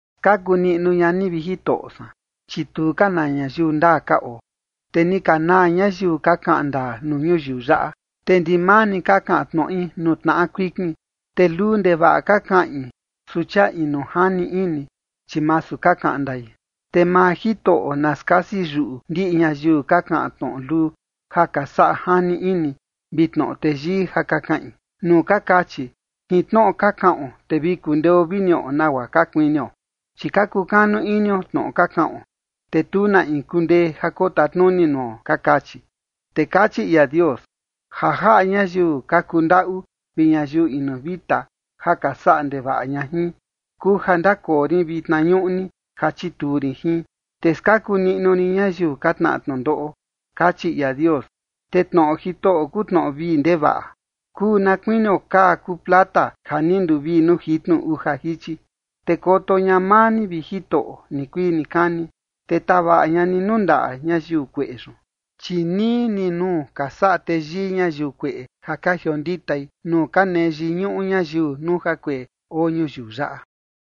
Skaku niꞌnu ña ni, vi Jitoꞌo san, chi tu ka na ñayiu ndaa ka oo, te ni ka naa ñayiu ka kaꞌan ndaa nuu ñuyiu yaꞌa. Te ndimaa ni ka kaꞌan tnoꞌi nuu tnaꞌa kuikin, te luu ndevaꞌa ka kaꞌin, su chia inu jani ini, chi masu ka kaꞌan ndai. Te maa Jitoꞌo na skasi yuꞌu ndiꞌi ñayiu ka kaꞌan tnoꞌo luu ja ka saꞌa jani ini vi tnoꞌo teyii ja ka kaꞌin, nuu ka kachi: “Jin tnoꞌo ka kaꞌon, te vi kundeo vi niꞌo nagua ka kuinio, chi ka kukanu inio tnoꞌo ka kaꞌon, te tu na in kundee ja kotatnuni nuo”, ka kachi. Te kachi ia Dios: “Ja jaꞌa ñayiu ka kundaꞌu vi ñayiu inu vita ja ka saꞌa ndevaꞌa ña jin, kuu ja ndakoo rin vitna ñuꞌni ja chituu rin jin, te skaku niꞌnu rin ñayiu ka tnaꞌa tnundoꞌo”, kachi ia Dios. Te tnoꞌo Jitoꞌo kuu tnoꞌo vii ndevaꞌa, kuu na kuinio kaa kuu plata ja ni nduvii nuu jitnu uja jichi. Te koto ña maa ni, vi Jitoꞌo, nikuii nikani, te tavaꞌa ña ni nuu ndaꞌa ñayiu kueꞌe yun. Chi nii ni nuu ka saꞌa teyii ñayiu kueꞌe ja ka jionditai, nuu ka nee yiñuꞌu ñayiu nuu jakueꞌe oo ñuyiu yaꞌa.